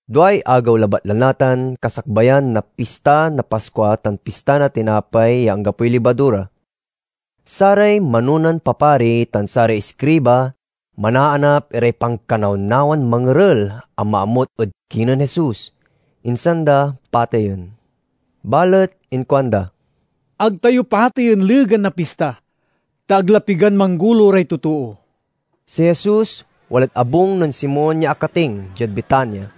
Duay agew labat la natan kasakbayan na Pista na Paskua tan pista na Tinapay ya Anggapoy Libadura. Saray manonan papari tan saray iskriba manaanap iray pankanawnawan mangerel a maamut ed kinen Jesus, insan da pateyen. Balet inkuanda, "Ag tayo pateyen legan na pista, ta ag la pigan manggolo ray totoo." Si Jesus walad abung nen Simon ya akating, diad Betania.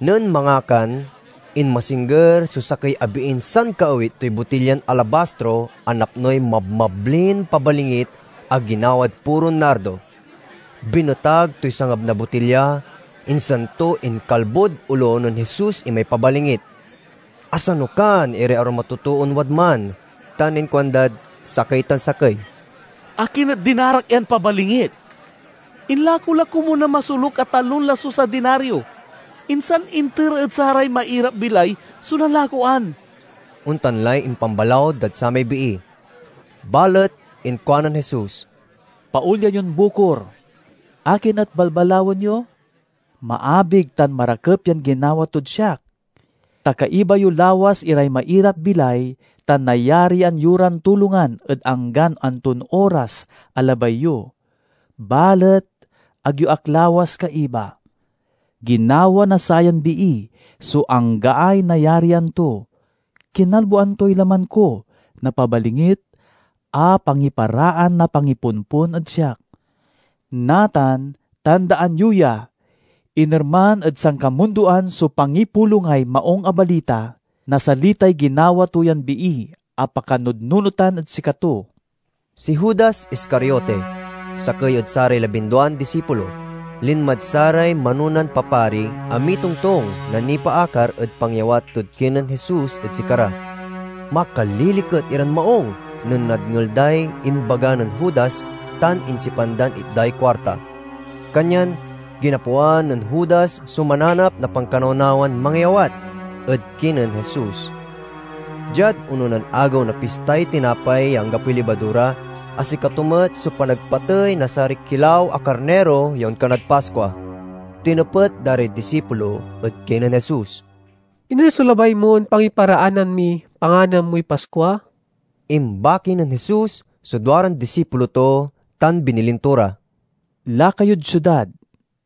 Nen mangakan, inmasingger so sakey a biin sankaawit toy botilyan alabastro a napnoy mabmablin pabalingit a ginawad puron nardo. Binetag toy sangab na botilya, insan to inkalbod olo nen Jesus imay pabalingit. Asanukan iray arum a totoon wadman tan inkuandad sakey tan sakey, "Akin et dinarak yan pabalingit? Inlako la komun na masoluk a talon lasus a dinario, insan inter ed saray mairap-bilay so nanlakoan!" Ontan lay impambalaw dad samay bii. Balet inkuanen Jesus, "Paolyan yon bukor! Akin et balbalawen yo? Maabig tan marakep yan ginawa tod siak. Ta kaiba yo lawas iray mairap-bilay tan nayarian yo ran tulongan ed anggan anton oras a labay yo. Balet ag yo ak lawas kaiba. Ginawa na sayan bii so anggaay nayarian to. Kinalboan toy laman ko na pabalingit a pangiparaan na pangipompon ed siak. Natan, tandaan yo ya! Inerman ed sankamundoan so pangipulongay Maung a Balita, nasalitay ginawa to yan bii a pakanudnunotan ed sikato." Si Judas Iscariote, sakey ed saray labinduan disipulo, linmad saray manonan papari a mitongtong na nipaakar ed pangyawat tod kinen Jesus ed sikara. Makaliliket iran maung nen nadngel day imbaga nen Judas tan insipan dan itday kuarta. Kanyan ginapoan nen Judas so mananp na pankanawnawan mangyawat ed kinen Jesus. Diad ononan agew na Pistay Tinapay ya Anggapoy Libadura, a sikato met so panagpatey na saray kilaw a karniro ya onkanad Paskua, tinepet da ray disipulo ed kinen Jesus, "Iner so labay mon pangiparaanan miy panganan moy Paskua?" Imbaki nen Jesus so duaran disipulo to tan binilin to ra, "Laka yod siudad.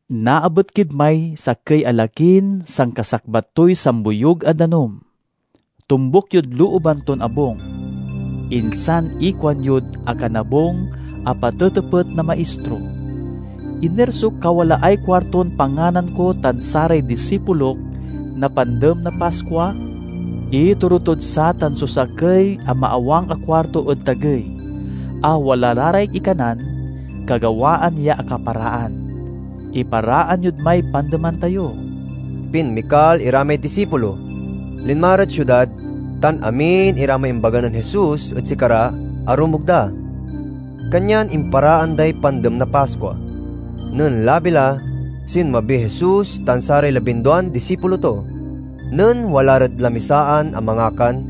Naabet kid may sakey a lakin sankasakbat toy samboyug a danum. Tombuk yod looban ton abung. Insan ikuanyod akanabung a patetepet na Maistro: 'Iner so kawalaay kuarton panganan ko tan saray disipulok na Pandem na Paskua?' Itoro tod satan so sakey a maawang a kuarto ed tagey, a wala la ray ikanan kagawaan ya akaparaan. Iparaan yod may pandeman tayo." Pinmikal ira may disipulo, linma rad siudad, tan amin ira may imbaga nen Jesus ed sikara arumog da. Kanyan imparaan day Pandem na Paskua. Nen labi la, sinmabiy Jesus tan saray labinduan disipulo to. Nen wala rad lamisaan a mangakan,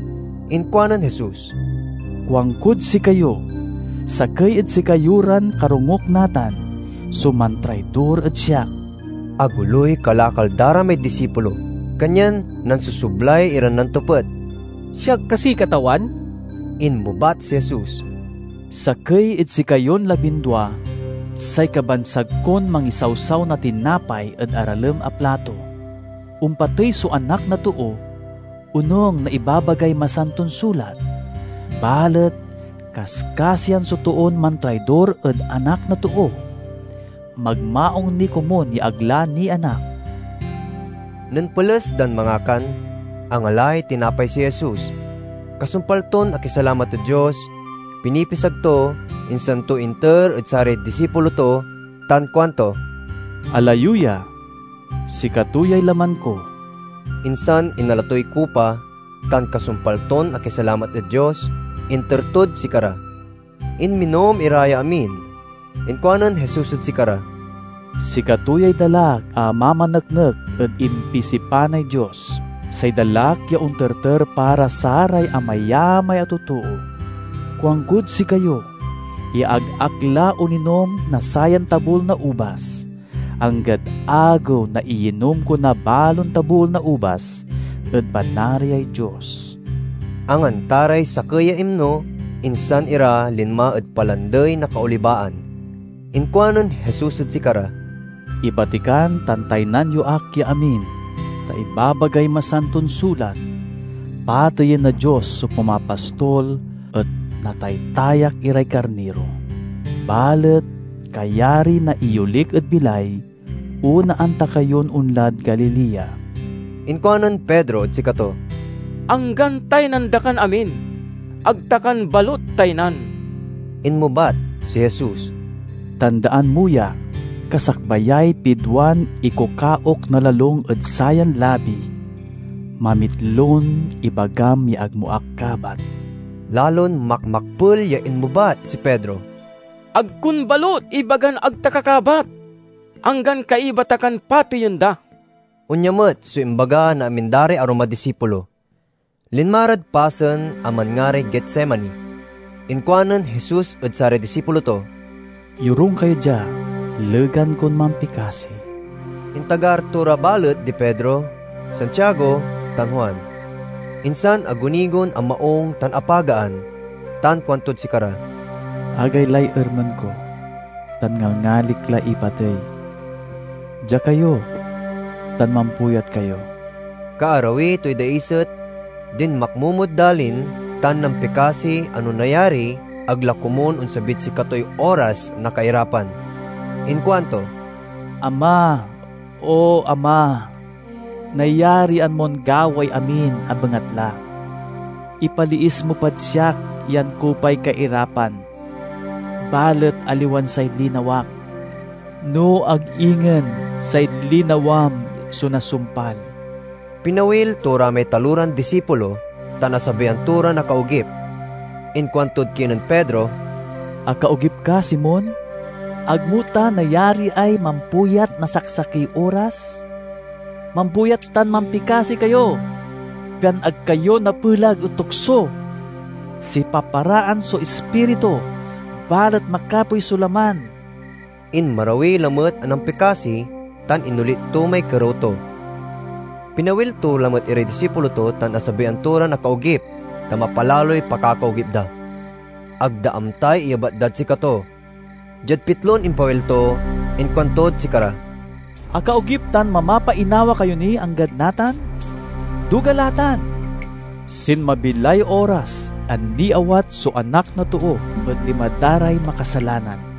inkuanen Jesus, "Kuankod sikayo: sakey ed sikayo ran karongok natan so mantraidor ed siak." Agoloy kalakal da ray may disipulo kanyan nansosoblay iran nantepet, "Siak kasi, Katawan?" Inmebat si Jesus, "Sakey ed sikayon labindua, say kabansag kon mangisawsaw na tinapay ed aralem a plato. Ompatey so Anak na Too, onung na ibabagay Masanton Sulat, balet kaskasian so toon mantraidor ed Anak na Too! Magmaung ni komun ya ag la nianak!" Nen peles dan mangakan, angalay tinapay si Jesus. Kasumpal ton akisalamat ed Dios, pinipisag to, insan to inter ed saray disipulo to tan kuanto, "Ala yo ya; sikato yay laman ko." Insan inala toy kupa, tan kasumpal ton akisalamat ed Dios, inter tod sikara. Inminom ira ya amin. Inkuanen Jesus ed sikara, "Sikato yay dalak a mamaneknek ed impisipanay Dios, say dalak ya onterter para saray amayamay a totoo. Kuankod sikayo ya ag ak la oninom na sayan tabul na ubas, anggad agew na iyinom ko na balon tabul na ubas ed Panariay Dios." Anganta ray sakey ya imno, insan ira linma ed Palandey na Kaolibaan. Inkuanen Jesus ed sikara, "Ibatikan tan taynan yo ak ya amin, ta ibabagay Masanton Sulat, 'Pateyen na Dios so pumapastol et nataytayak iray karniro.' Balet kayari na iyolik ed bilay, onaan ta kayon onlad Galilea." Inkuanen Pedro ed sikato, "Anggan taynan da kan amin, ag ta kan balut taynan!" Inmebat si Jesus, "Tandaan mo ya! Kasakbayay pidwan ikukaok na lalung ed sayan labi, mamitlon ibagam ya ag mo ak kabat." Lalon makmakpel ya inmebat si Pedro, "Ag kon balut ibagan ag ta ka kabat, anggan kaiba ta kan pateyen da!" Onya met so imbaga na amin da ray arum a disipulo. Linma rad pasen a manngaray Getsemani. Inkuanen Jesus ed saray disipulo to, "Yorung kayo dia, legan kon mampikasi." Intagar to ra balet di Pedro, Santiago, tan Juan. Insan agunigon a maung tan apagaan tan kuantod sikara, "Agaylay ermen ko tan ngalngalik la ipatey. Dia kayo tan mampuyat kayo." Kaarawi toy daiset, dinmakmomod dalin tan nampikasi a no nayari ag la komun onsabid sikatoy oras na kairapan. Inkuanto, "Ama, O Ama! Nayarian mon gawaey amin a bengatla. Ipaliis mo pad siak yan kupay kairapan. Balet aliwan say linawak, no ag ingen say linawam, so nasumpal." Pinawil to ra may taloran disipulo, tan asabian to ran akaogip. Inkuantod kinen Pedro, "Akaogip ka, Simon? Ag mo ta nayariay mampuyat na saksakey oras? Mampuyat tan mampikasi kayo, pian ag kayo napelag ed tukso. Sipaparaan so ispiritu, balet makapoy so laman." Inmarawi lamet a nampikasi, tan inolit to may kerew to. Pinawil to lamet iray disipulo to tan asabian to ran akaogip, ta mapalaloy pakakaogip da. Ag da amtay iyebat dad sikato. Diad pitlon impawil to inkuantod sikara, "Akaogip tan mamapainawa kayo nin anggad natan? Duga la tan! Sinmabi lay oras a niawat so Anak na Too ed lima da ray makasalanan.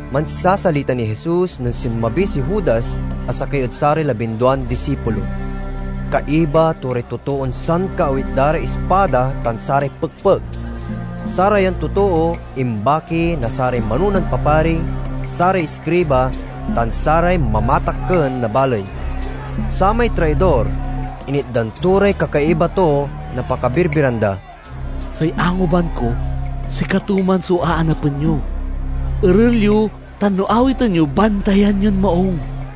Mansasalita niy Jesus nen sinmabi si Judas a, sakey ed saray labinduan disipulo. Kaiba to ray totoon sankaawit da ray ispada tan saray pekpek. Sarayan totoo imbaki na saray manonan papari, saray iskriba, tan saray mamatakken na baley. Samay traidor initdan to ray kakaiba to na pakabirbiran da: "Say anguban ko sikato man so aanapen yo. Erel yo tan no awiten yo, bantayan yon maung."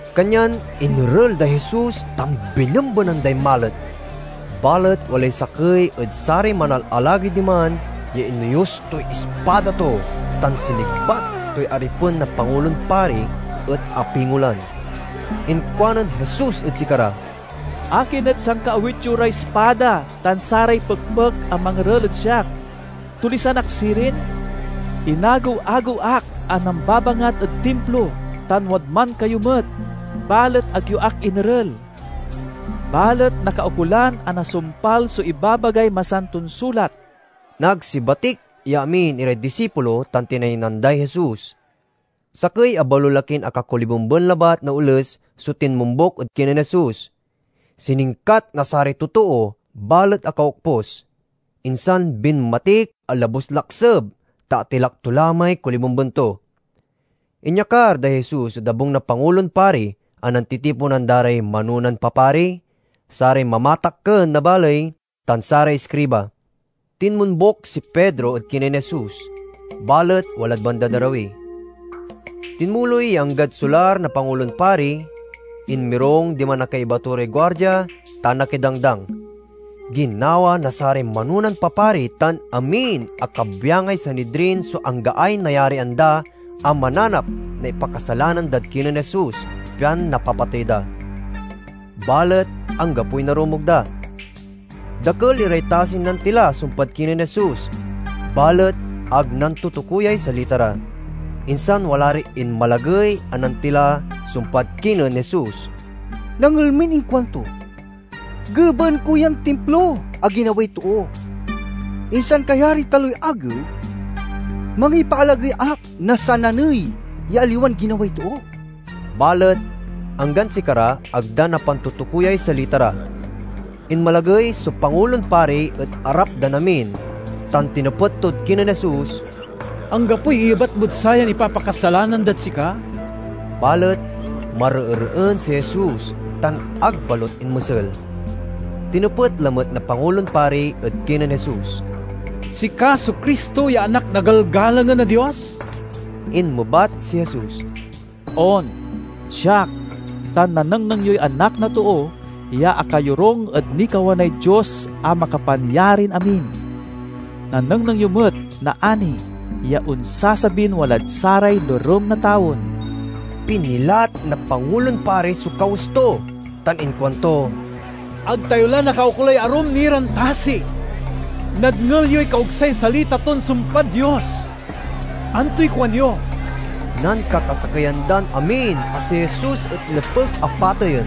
Kanyan inerel day Jesus tan binembenan day malet. Balet walay sakey ed saray manalalagey diman ya inoyus toy ispada to tan sinigbat toy aripen na Pangulon Pari, et apingolan. Inkuanen Jesus ed sikara, "Akin et sankaawit yo ray ispada tan saray pekpek a mangerel ed siak? Tulisan ak sirin? Inagew-agew ak a nambabangat ed Timplo tan wadman kayo met, balet ag yo ak inerel Balet nakaukolan a nasumpal so ibabagay Masanton Sulat." Nagsibatik ya amin iray disipulo tan tinaynan day Jesus. Sakey a balolakin akakolibemben labat na oles so tinmombuk ed kinen Jesus. Siningkat na saray totoo balet akaokpus, insan binmatik a labus-lakseb ta atilak to la may kolibemben to. Inyakar day Jesus ed abung na Pangulon Pari, a nantitiponan da ray manonan papari, saray mamatakken na baley, tan saray iskriba. Tinmombuk si Pedro ed kinen Jesus, balet walad bandad arawi. Tinmuloy ya anggad solar na Pangulon Pari, inmirung diman a kaiba to ray guardia, tan akidangdang. Ginawa na saray manonan papari tan amin a kabyangay Sanidrin so anggaay nayarian da a mananap na ipakasalanan dad kinen Jesus, pian napapatey da. Balet anggapoy narumog da. Dakel iray tasin nantila sumpad kinen Jesus, balet ag nantutukoyay salita ra. Insan wala ray inmalagey a nantila sumpad kinen Jesus. "Nadngel min inkuanto, 'Gebaen ko yan Timplo a ginaway too, insan kayariy taloy agew mangipaalagey ak na sananey ya aliwan ginaway too.'" Balet anggan sikara ag da napantutukoyay salita ra. Inmalagey so Pangulon Pari ed arap dan amin, tan tinepet tod kinen Jesus, "Anggapoy iyebat mod sayan ipapakasalanan dad sika?" Balet mareereen si Jesus tan ag balut inmesel. Tinepet lamet na Pangulon Pari ed kinen Jesus, "Sika so Cristo ya Anak na Galgalangen a Dios?" Inmebat si Jesus, "On, siak, tan nanengneng yoy Anak na Too ya akayorung ed nikawanay Dios a Makapanyarin-amin. Nanengneng yo met naani ya onsasabin walad saray lorem na tawen!" Pinilat na Pangulon Pari so kawes to tan inkuanto, "Ag tayo la nakaukolay arum ni ran tasi! Nadngel yoy kaogsay salita ton sumpad Dios! Antoy kuanyo?" Nankakasakeyan dan amin a si Jesus et nepeg a pateyen.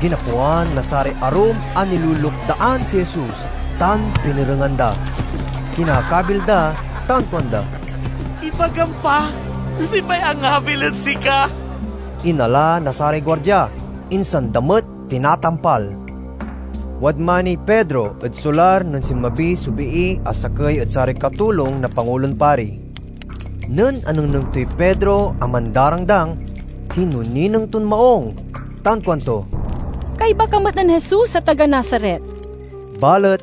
Ginapoan na saray arum a nilulukdaan si Jesus tan pinerengan da. Kinakabil da ran kuanda, "Ibagam pa no siopay angabil ed sika?" Inala na saray guardia, insan da met tinatampal. Wadman niy Pedro ed solar nen sinmabi so bii a sakey ed saray katulong na Pangulon Pari. Nen anengneng toy Pedro a mandarangdang, kinonineng ton maung tan kuanto, "Kaiba ka met nen Jesus a taga Nazaret." Balet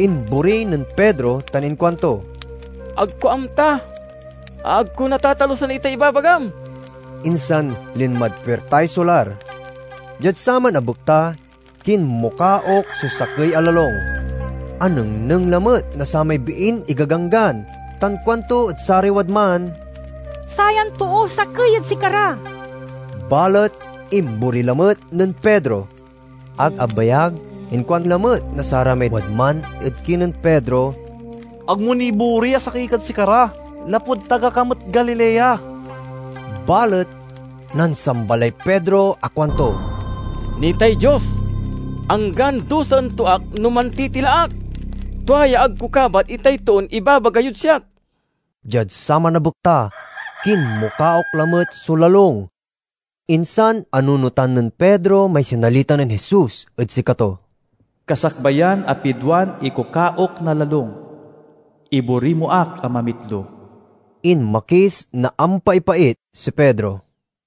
imbori nen Pedro tan inkuanto, "Ag ko amta...ag ko natatalusan itay ibabagam!" Insan linmad puirtay solar. Diad saman a bekta kinmukaok so sakey a lalung. Anengneng lamet na samay biin igaganggan tan kuanto ed saray wadman, "Sayan too sakey ed sikara!" Balet imbori lamet nen Pedro. Ag abayag, inkuan lamet na saramay wadman ed kinen Pedro, "Ag mo nibori a sakey kad sikara, lapud taga ka met Galilea." Balet nansamba lay Pedro a kuanto, "Nitay Dios, anggan duasen to ak no mantitila ak! Tua ya ag ko kabat itay toon ibabaga yod siak!" Diad saman a bekta, kinmukaok lamet so lalung. Insan anunotan nen Pedro may sinalita nen Jesus ed sikato, "Kasakbayan a pidwan ikukaok na lalung, ibori mo ak a mamitlo!" Inmakis na ampaipait si Pedro.